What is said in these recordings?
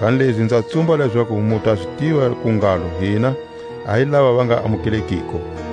Kanilezi nza tsumba lezaku mu ta zi tiva ku ngalo hina a hi lava va nga amukelekiko.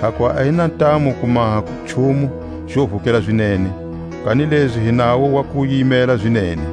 Hakuva a hi na ntamu ku maha nchumu xo vukela zinene, kanilezi hi nawo wa ku yimela zinene.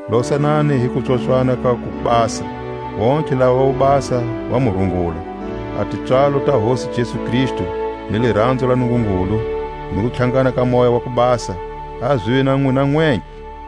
Losanani hi kupswopswa ka kubasa. Vontlhe lava vobasa va mu rungula. A tipswalo ta Hosi Jesu Kristu, ni liranzo la Nungungulu, ni kutlhangana ka Moya wa ku Basa, a zive na nwina nwenthle.